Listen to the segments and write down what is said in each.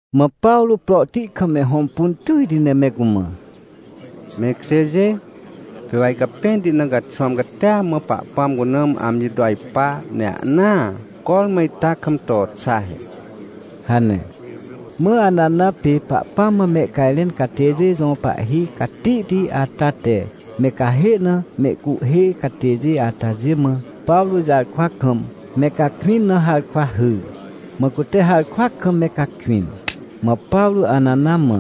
Mã Pawrô prohti kam me hõmpun tỳjti ne me cumã: — Me ikjêjê! Pê wa icapẽnti na caxwãm catia mã Pahpãm cuna mã amji to ajpa, ne ahnaa cormã ita kam to xa he — hane. Mã Anana pê Pahpãm mã mehcajrẽn catêjê jõ pahhi catihti ata te me cahê na mehcuhhê catêjê atajê mã Pawrô jarkwa kam me cakwĩn na harkwa hyr. Mã cute harkwa kam me cakwĩn. Mã Pawrô Anana mã: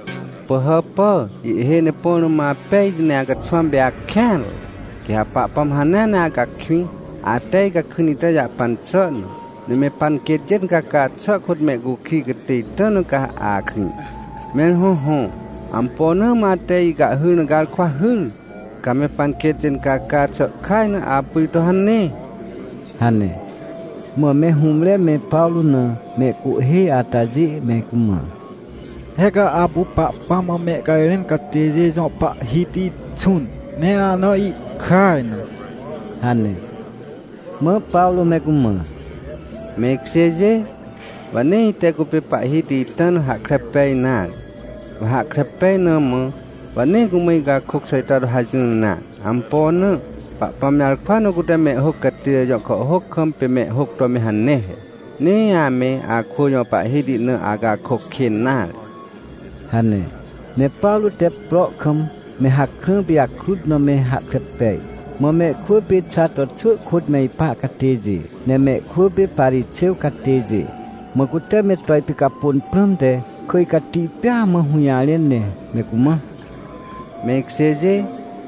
— Pỳhàpà, ihhêj ne põ rũm apejti, ne acaxwãm pê akêanre! Quê ha Pahpãm hanea ne acakwĩ, ate icakwĩn ita jahpan xà na. Ne me panquêtjê incaca xà kôt mehcukij catê ita na ca akrĩ. Mẽr hõhõ, ampo na mã ate icahhyr na garkwa hyr? Ca me panquêtjê incaca xà ihkaj na apu ito hane — hane. Mã me hũmre me Pawrô na mehcuhhê atajê me cumã: — He ca apu Pahpãm mã mehcajrẽn catêjê jõ pahhiti xũn, ne ahna ihkaj na — hane. Mã Pawrô me cumã: — Me ikjêjê, wa nee ite cupê pahhiti ita na hahkre pej nare. Wa hahkre pej na mã, wa nee cumã icakôc xà ita to hajỹr nare. Ampo na? Pahpãm jarkwa na cute mehhôc catêjê jõ kàhhôc kam pê mehhôc to me hane he: “Nee ame akwỳ jõ pahhiti na acakôc kên nare” — hane. Ne Pawrô te prohkam me hakrã pijakrut na me hahkre pej, mã mehkwỳ pê Xato xwỳ kôt me ipa catêjê, ne mehkwỳ pê Parixêw catêjê. Mã cute me to ipicapôn prãmte kỳj cati pêa mã hũjarẽn, ne me cumã: — Me ikjêjê,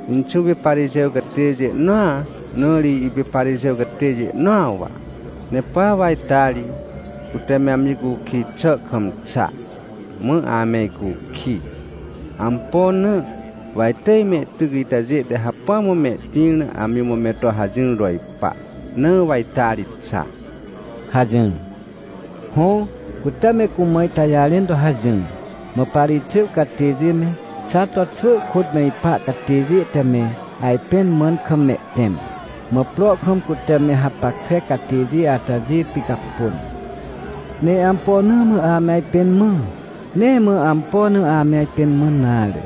inxũ pê Parixêw catêjê nõa, na ri ipê Parixêw catêjê nõa wa. Ne pa wa ita ri, cute me amji cukij xà kam xa, mã ame icukij. Ampo na? Wa itỳj mehtyc itajê te hacpỹa mã mehtĩr na amji mã me to hajỹr to ipa, na wa ita ri xa — hajỹr. Hõ, cute me cumã ita jarẽn to hajỹr. Mã Parixêw catêjê me Xato xwỳ kôt me ipa catêjê te me ajpẽn mãn kam mehtẽm, mã prohkam cute me hapackre catêjê atajê picapôn. Ne ampo na mã ame ajpẽn mã? Nee mã ampo na amẽ ajpẽn mãn nare.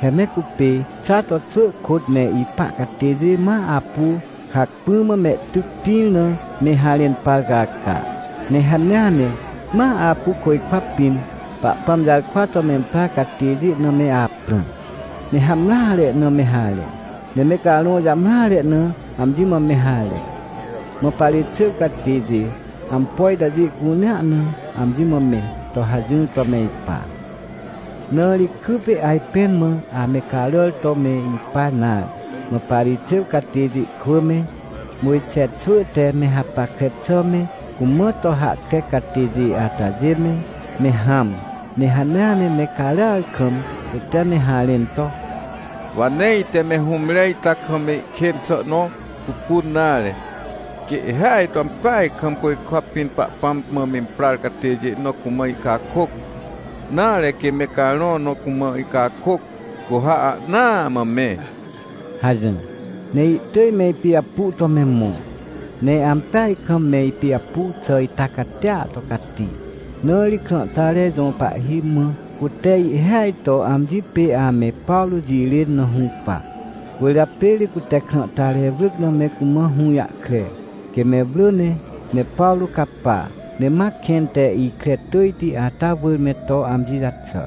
He me cupê Xato xwỳ kôt me ipa catêjê ma apu hacpỹ mã mehtyc tĩr na me harẽn par caca, ne hanea ne ma apu côjkwa pĩn Pahpãm jarkwa to memprar catêjê na me aprã, ne hamreare na me harẽ, ne me carõ jamreare na amji mã me harẽ. Mã Parixêw catêjê ampo itajê cunea na amji mã me to hajỹr to me ipa. Na ri kypê ajpẽn mã ame caràr to me ipa nare. Mã Parixêw catêjê kwỳ me, Mojxe xwỳ te me hapackre xà me cumã to hahkre catêjê atajê me, me hãm, ne hanea ne me caràar kam, cute me harẽn to: — Wa nee ite me hũmre ita kam ihkên xà nõ pupun nare. Quê ihhêaj to ampeaj kam côjkwa pĩn Pahpãm mã imprar catêjê nõ cumã ihcakôc, nare, quê me carõ nõ cumã ihcakôc, cu ha ahnaa mã me — hajỹr. Ne ihtỳj me ipijapu to me mõ, ne ampeaj kam me ipijapu xà ita catia to cati, na ri krãhtare jõ pahhi mã cute ihhêaj to amji pê ame Pawrô jirên na hũpa. Cwỳrjapê ri cute krãhtare wrỳc na me cumã hũjahkre, quê me wrỳ ne me Pawrô capa, ne ma kẽn te ikre tỳjti ata wỳr me to amji jaxà.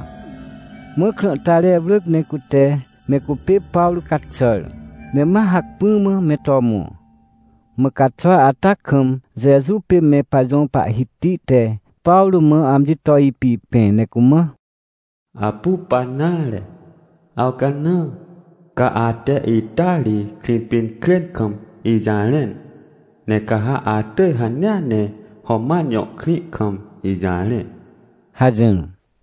Mã krãhtare wrỳc ne cute me cupê Pawrô caxàr, ne ma hacpỹ mã me to mõ. Mã caxwa ata kam Jeju pê me pajõ Pahhiti te Pawrô mã amji to ipipẽ ne cumã: — Apu pa nare, awcanã. Ca ate ita ri Krĩpinkrên kam ijarẽn, ne ca ha atỳj hanea ne Roman jõ krĩ kam ijarẽ — hajỹr.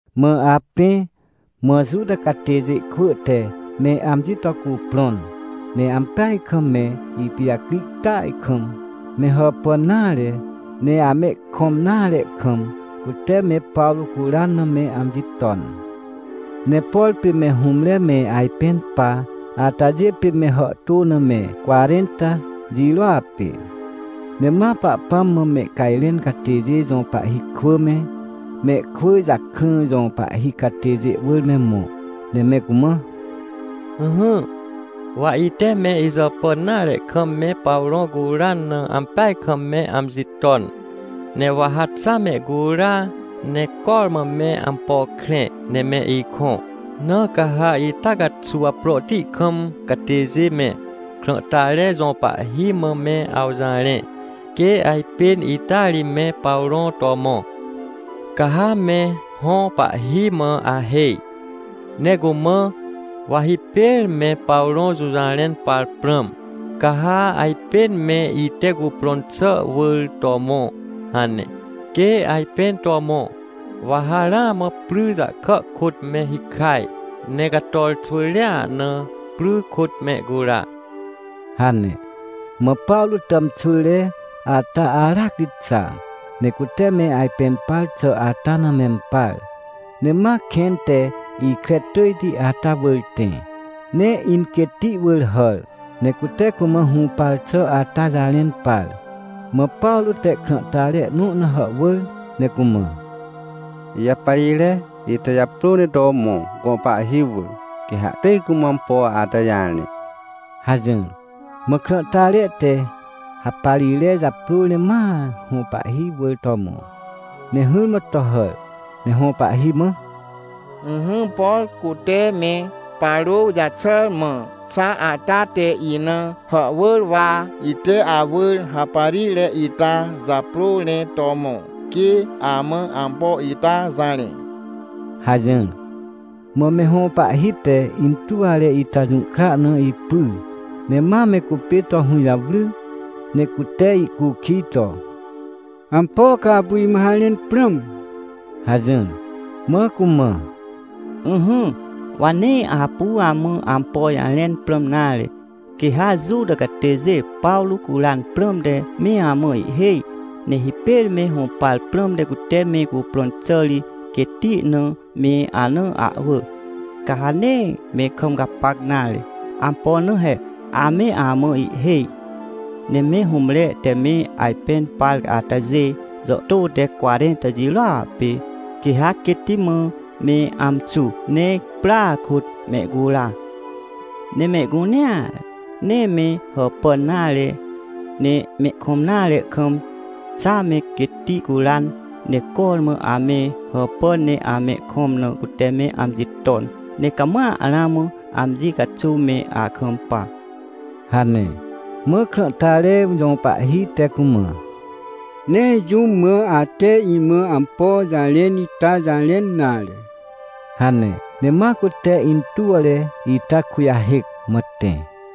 Mã apẽ, mã Juta catêjê kwỳ te me amji to cuprõn, ne ampeaj kam me ipijacri tỳaj kam, me hàpàn nare, ne amehkõm nare kam, cute me Pawrô curan na me amji ton. Ne por pê me hũmre me ajpẽn pa atajê pê me hàhtô na me cwarẽnta jirôa pê. Ne ma Pahpãm mã mehcajrẽn catêjê jõ pahhi kwỳ me, mehkwỳ jakrã jõ pahhi catêjê wỳr me mõ, ne me cumã: — Ỹhỹ, wa ite me ijàpàn nare kam me Pawrô curan na ampeaj kam me amji ton, ne wa ha xa mehcura, ne cormã me ampo krẽ, ne me ikõ. Na ca ha ita caxuw prohti kam catêjê me, krãhtare jõ pahhi mã me awjarẽ, quê ajpên ita ri me Pawrô to mõ. Ca ha me hõ pahhi mã ahêj, ne cumã: “Wa hipêr me Pawrô jũjarẽn par prãm, ca ha ajpên me ite cuprõn xà wỳr to mõ” hane. Quê ajpên to mõ, wa ha ramã pry jahkà kôt me hikaj, ne cator xwỳjrea na pry kôt mehcura — hane. Mã Pawrô tàmxwỳre ata aracri xa, ne cute me ajpẽn par xà ata na mempar, ne ma kẽn te ikre tỳjti ata wỳr tẽ, ne inquêtti wỳr hàr, ne cute cumã hũpar xà ata jarẽn par. Mã Pawrô te krãhtare nõ na hàhwỳr, ne cumã: — Ijaparire ita japrô ne to mõ, gõ pahhi wỳr. Quê ha ihtỳj cumã ampo ata jarẽ — hajỹr. Mã krãhtare te haparire japrôr ne ma hõ pahhi wỳr to mõ, ne hỹrmã to hàr, ne hõ pahhi mã: — Ỹhỹ, por cute me Pawrô jaxàr mã xa ata te ina hàhwỳr, wa ite awỳr haparire ita japrôr ne to mõ, quê amã ampo ita jarẽ — hajỹr. Mã me hõ pahhi te intuwre ita jũhkra na ipyr, ne ma me cupê to hũjawry, ne cute ihcukij to: — Ampo ca apu imã harẽn prãm? — hajỹr. Mã cumã: — Ỹhỹ, wa nee apu amã ampo jarẽn prãm nare, quê ha Juta catêjê Pawrô curan prãmte me amã ihhêj, ne hipêr me hũpar prãmte cute me cuprõn xà ri quêtti na me ana ahwỳ. Ca ha nee me kam gapac nare. Ampo na? He ame amã ihhêj. Ne me hũmre te me ajpẽn par atajê jàhtô te cwarẽnta jirôa pê, quê ha quêtti mã me amxu ne prya kôt mehcura. Ne mehcunea ne me hàpàn nare, ne mehkõm nare kam, xa me quêtti curan, ne cormã ame hàpàn ne amehkõm na cute me amji ton, ne cama ramã amji caxuw me akampa — hane. Mã krãhtare jõ pahhi te cumã: — Nee jũm mã ate imã ampo jarẽn ita jarẽn nare — hane. Ne ma cute intuwre ita kujahêc, mã tẽ.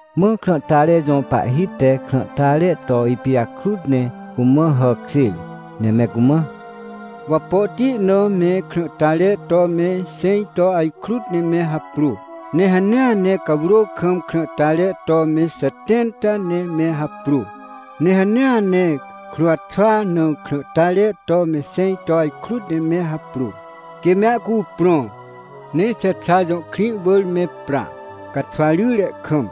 Mã krãhtare jõ pahhi te krãhtare to ipijakrut ne cumã hàkjêr ne me cumã: — Wapohti na me krãhtare to me xẽj to ajkrut ne me haprô, ne hanea ne cawrô kam krãhtare to me xetẽnta ne me haprô, ne hanea ne kruwxwa na krãhtare to me xẽj to ajkrut ne me haprô, quê me ahcuprõ, ne Xexa jõ krĩ wỳr me pra, caxwa ryre kam.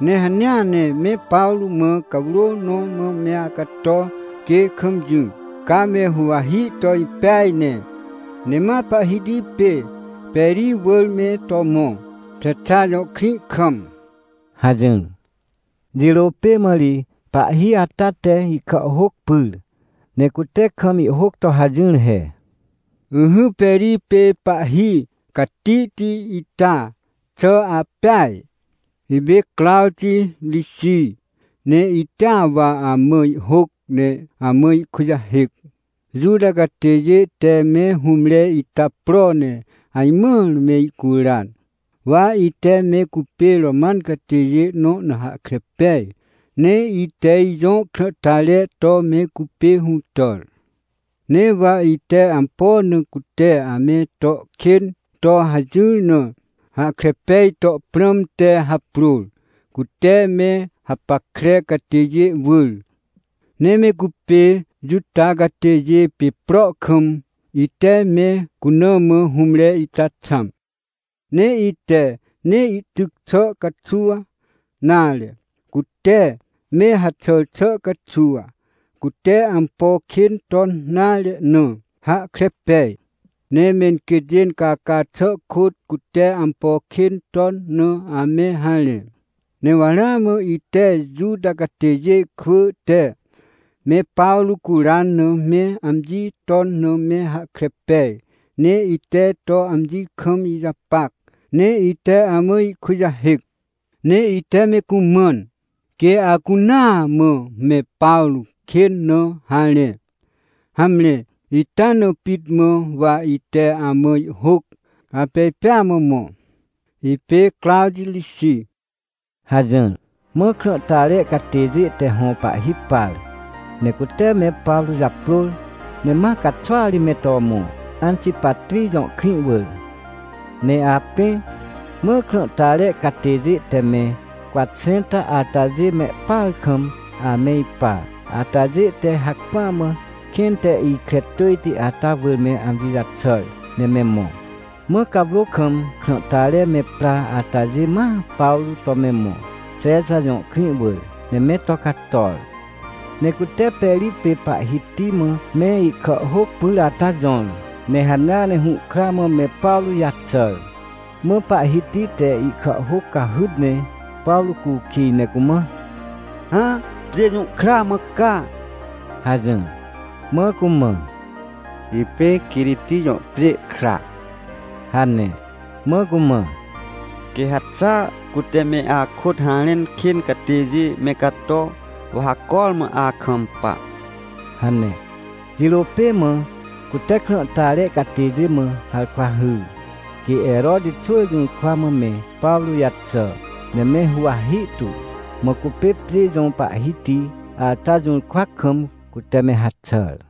Ne hanea ne me Pawrô mã cawrô nõ mã me acato, quê kam jỹ, ca me huwahi to impeaj ne, ne ma pahhiti pê Peri wỳr me to mõ, Xexa jõ krĩ kam — hajỹr. Jirô pê mã ri pahhi ata te ihkàhhôc pyr, ne cute kam ihhôc to hajỹr he: — Ỹhỹ, Peri pê pahhi catihti ita, xà apeaj? Ipê Crawti Rixij, ne itea wa amã ihhôc, ne amã ihkujahêc. — Juta catêjê te me hũmre ita pro ne ajmãr mehcuran. Wa ite me cupê Roman catêjê nõ na hahkre pej, ne ite ijõ krãhtare to me cupê hũtàr. Ne wa ite ampo na cute ame to kên to hajỹr na hahkre peaj to prãmte haprôr, cute me hapackre catêjê wỳr. Ne me cupê Juta catêjê pê prohkam, ite me cuna mã hũmre ita xãm. Ne ite nee ihtyc xà caxuw, nare, cute me haxàr xà caxuw, cute ampo kên ton nare na, hahkre pej. Ne menquêtjê caca xà kôt cute ampo kên ton na ame harẽ. Ne wa ramã ite Juta catêjê kwỳ te me Pawrô curan na me amji ton na me hahkre pej, ne ite to amji kam ijapac, ne ite amã ihkujahêc. Ne ite me cumãn, quê acunaa mã me Pawrô kên na harẽ. Hamre, ita na pit mã wa ite amã ihhôc, apej pêa mã mõ. Ipê Crawti Rixij — hajỹr. Mã krãhtare catêjê te hõ pahhi par, ne cute me Pawrô japrôr, ne ma caxwa ri me to mõ, Antipatrij jõ krĩ wỳr. Ne apẽ, mã krãhtare catêjê te me cwatxẽnta atajê mehpar kam ame ipa atajê te hacpỹa mã kẽn te ikre tỳjti ata wỳr me amji jaxàr ne me mõ. Mã cawrô kam krãhtare me pra atajê ma Pawrô to me mõ, Xexa jõ krĩ wỳr, ne me to cator. Ne cute Peri pê pahhiti mã me ihkàhhôc pyr ata jõr, ne hanea ne hũhkra mã me Pawrô jaxàr. Mã pahhiti te ihkàhhôc cahyt ne Pawrô cukij ne cumã: — Hã, pjê jũ kra mã ca? — hajỹr. Mã cumã: — Ipê Quiriti jõ pjê kra — hane. Mã cumã: — Quê ha xa cute me akôt harẽn kên catêjê me cato, wa ha cormã kampa — hane. Jirô pê mã cute krãhtare catêjê mã harkwa hyr, quê Heroti xwỳ jũrkwa mã me Pawrô jaxà, ne me huwahi tu. Mã cupê pjê jõ pahhiti ata jũrkwa kam, cute me haxàr.